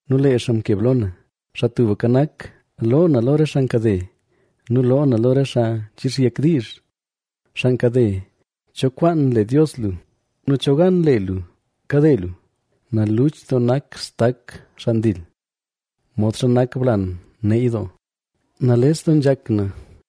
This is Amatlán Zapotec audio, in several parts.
nu lee xaa mkeb lo na. Xaa Tubka Nak, loo na lo re xaa nkade nu loo na lo re xaa nchixyek diizh. Xaa nkade, ¿cho kwaan le Dios lu? nu ¿cho gan le lu kade lu? Naluch doo nak stak xaa ndil, modxa nak blan neey doo. ¡Nales doo nzhak na,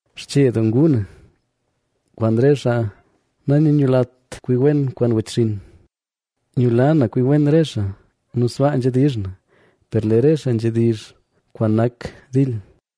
Xche doo nguu na, kwaan re xaa nanyawlat kwi wen kwaan wechxinn. Nyula na kwi wen xaa; nu sbaa nzhedizh na, per lee re xaa nzhedizh kwaan nak dil.